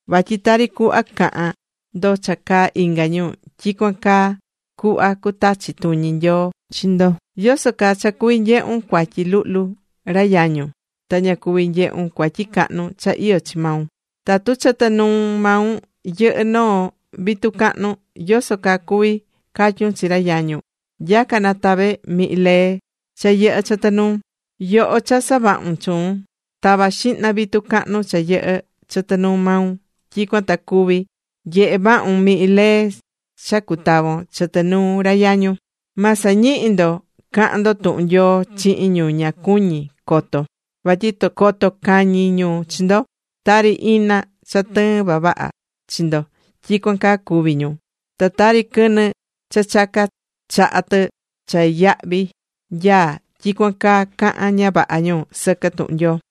Vatyi tari cuhva cahán ndo cha caá inga ñu, tyicuan caa cuhva cutachi tuñi Nyoo chi ndo. ¿Yoso caa cha cuví nyehun cuatyi luhlu ra yañun ta ña cuví nyehún cuatyi cahnu cha iyó chi maun? Tatu chɨtɨ nuu maun yɨhɨ́ noo vitu cahnu, ¿yoso caa cuví catyun chi ra yañun: “Nya̱ca, na tave mihin lee cha yɨhɨ́ chɨtɨ nuun”? Yoho cha savahún chuun, ta̱va xihna vitu cahnu cha yɨhɨ́ chɨtɨ nuu maun, tyicuan ta cuvi nyehe vahun mihin lee cha cutavon chɨtɨ nuu ra yañun. ’Ma sañihi ndo cahan ndo tuhun Nyoo chihin ñu ña cuñí coto, vatyi coto cañi ñu chi ndo. Tari ina cha tɨɨn vavaha chi ndo, tyicuan caa cuví ñu. Ta tari quɨnɨ cha chaca chaha tɨ cha yahvi nyaá, tyicuan caa cahán ña vaha ñu sɨquɨ tuhun Nyoo.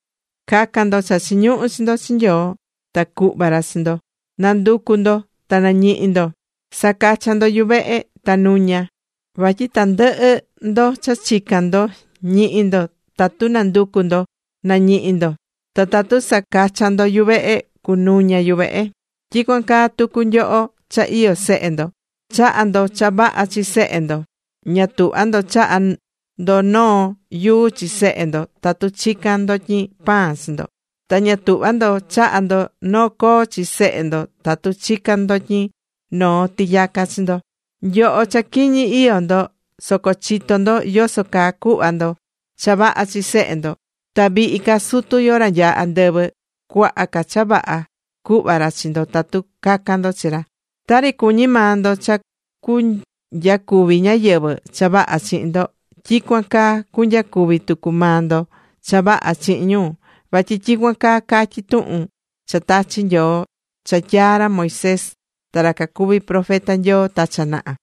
’Ca̱can ndo cha chiñuhú chi ndo chi Nyoo. Ta cuhva ra chi ndo. Na̱nducu ndo, ta nañihi ndo. Sa̱cachan ndo yuvehe, ta nuña. Vatyi tandɨhɨ ndo cha chicán ndo, ñihi ndo. Tatu nanducú ndo, nañihi ndo. Ta tatu sacachán ndo yuvehe, cunuña yuvehe. ’Tyicuan caa tucu nyoho cha iyó sehe ndo. Chahá ndo cha vaha chi sehe ndo. Ña tuhvá ndo chaha ndo noo yuu chi sehe ndo, tatu chicán ndotyin pan chi ndo. Ta ña tuhvá ndo chaha ndo noo coo chi sehe ndo tatu chicán ndotyin noo tiyaca chi ndo. Nyoho cha quiñi iyó ndo soco chitó ndo yoso caa cuhva ndo cha vaha chi sehe ndo. Ta vihi ca Sutu yo, ra nyaá andɨvɨ. Cuaha ca cha vaha cuhva ra chi ndo tatu cacan ndo chi ra. ’Tari cuñí maa ndo cha cunyacuvi ñáyɨvɨ cha vaha chihin ndo, tyicuan caa cunyacuvi tucu maa ndo cha vaha chihin ñu. Vatyi tyicuan caa catyí tuhun cha tachi̱ Nyoo, cha tyaa̱ ra Moisés ta ra cacuvi̱ profeta Nyoo ta cha naha.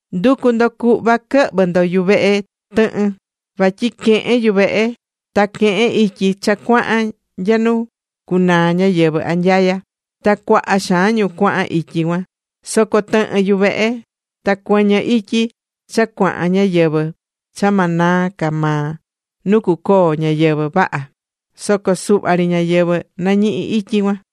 ’Ndu̱cu ndo cuhva quɨhvɨ ndo yuvehe tɨhɨn. Vatyi quehen yuvehe, ta quehen ityi cha cuahan nya nu cunaa ñáyɨvɨ anyaya. Ta cuaha xaan ñu cuahan ityi cuan. Soco tɨhɨn yuvehe ta cuɨñɨ ityi cha cuahan ñayɨvɨ̱ cha ma naa ca maa nu cucoo ñáyɨvɨ vaha. Soco suhva ri ñáyɨvɨ nañihí ityi cuan.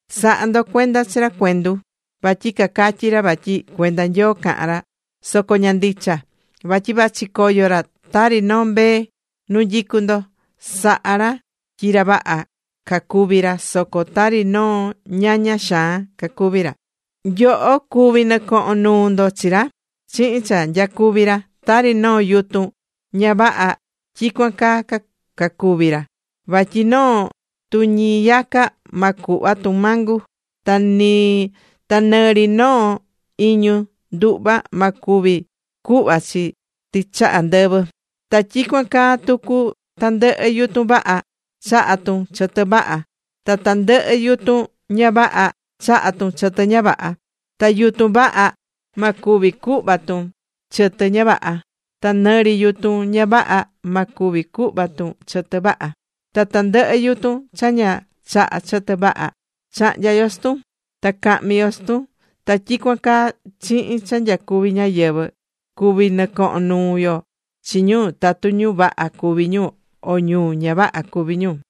’Sa̱ha ndo cuenda chi ra cuendu. Vatyi cacatyí ra vatyi cuenda Nyoo cahán ra. Soco ña ndicha. Vatyi vachi coyo ra tari noo mbee nu nyicú ndo. Sahá ra tyi ra vaha cacuví ra. Soco tari noo ñaña xaan cacuví ra. Nyoho cuví nɨcohón nuu ndo chi ra chihin cha nyacuví ra. Tari noo yutun ña vaha, tyicuan caa cacuví ra. Vatyi noo tuñiyaca ma cuhva tun mango, ta nɨ ri noo iñu nduhva ma cuvi cuhva chi tɨchaha ndɨvɨ. Ta tyicuan caa tucu tandɨhɨ yutun vaha. Chahá tun chɨtɨ vaha. Ta tandɨhɨ yutun ña vaha, chahá tun chɨtɨ ña vaha. Ta yutun vaha, ma cuvi cuhva tun chɨtɨ ña vaha. Ta nɨ ri yutun ña vaha ma cuvi cuhva tun chɨtɨ vaha. Ta tandɨhɨ yutun cha ña chahá chɨtɨ vaha, cahnya yo chi tun. Ta cahmi yo chi tun. Ta tyicuan caa, chihin cha nyacuví ñáyɨvɨ cuví nɨcohon nuu ndo chi ñu tatu ñu vaha cuví ñu, o ñu ña vaha cuví ñu.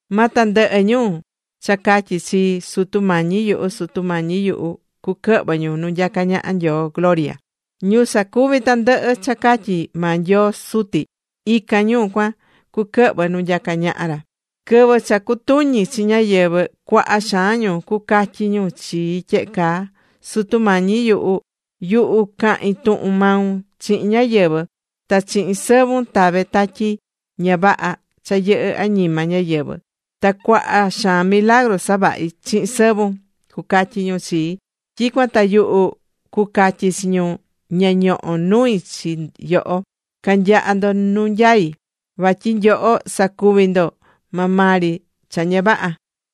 ’Ma tandɨhɨ ñu cha catyí chii: “Sutu Mañi yuhu, Sutu Mañi yuhu”, cuquɨhvɨ ñu nu nyacá ñaha Nyoo gloria. Ñu sacuví tandɨhɨ cha catyí maa Nyoo Suti, ican ñu cuan cuquɨhvɨ nu nyacá ñaha ra. Quɨvɨ cha cucutuñi chi ñáyɨvɨ, cuaha xaan ñu cucatyi ñu chii tyehe caa: “Sutu Mañi yuhu. Yuhu cahi̱n tuhun maun chihin ñáyɨvɨ. Ta chihin sɨvun tave̱ tatyi ña vaha cha yɨhɨ̱ añima ñáyɨvɨ. Ta cuaha xaan milagru savahi̱ chihin sɨvun”, cucatyi ñu chii. ’Tyicuan ta yuhu cucatyi chi ñu: “Ña ñohó nui chi nyoho. Ca̱nyaha ndo nu nyaí. Vatyi nyoho sacuvi̱ ndo maa maa ri cha ña vaha.”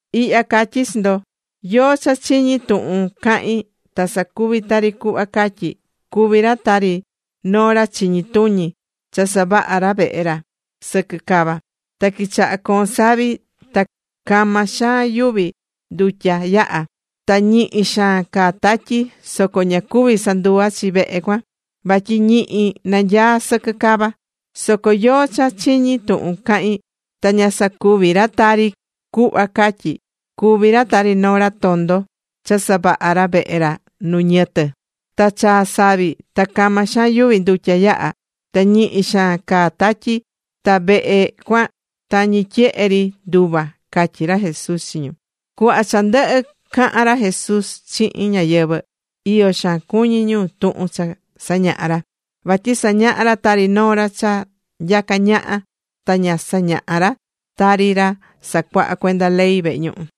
’Ihya catyí chi ndo, yóó cha chiñí tuhun cahín ta sacuví tari cuhva catyí; cuví ra tari noo ra chiñi tuñi cha savaha̱ ra vehe ra sɨquɨ cava. Ta quichaha̱ coon savi. Ta cama xaan yuvi ndutya yaha̱. Ta ñihi xaan caa̱ tatyi. Soco ña cuvi̱ sanduva chi vehe cuan. Vatyi ñihi nanyaá sɨquɨ cava cuan. Soco yóó cha chiñí tuhun cahín, ta ña sacuví ra tari cuhva catyí; cuví ra tari noo ra tondo, cha savaha̱ ra vehe ra nu ñɨtɨ. Ta chaa̱ savi. Ta cama xaan yuvi ndutya yaha̱. Ta ñihi xaan caa̱ tatyi. Ta vehe cuan tañi tyehe ri nduva̱ ―catyí ra Jesús chi ñu. Cuhva cha ndɨhɨ̱ cahan ra Jesús chihin ñáyɨvɨ, iyo xaan cuñi̱ ñu tuhun cha sañahá ra. Vatyi sañahá ra tari noo ra cha nyacá ñaha. Ta ña sañahá ra tari ra sacuahá cuenda ley vehe ñuhu.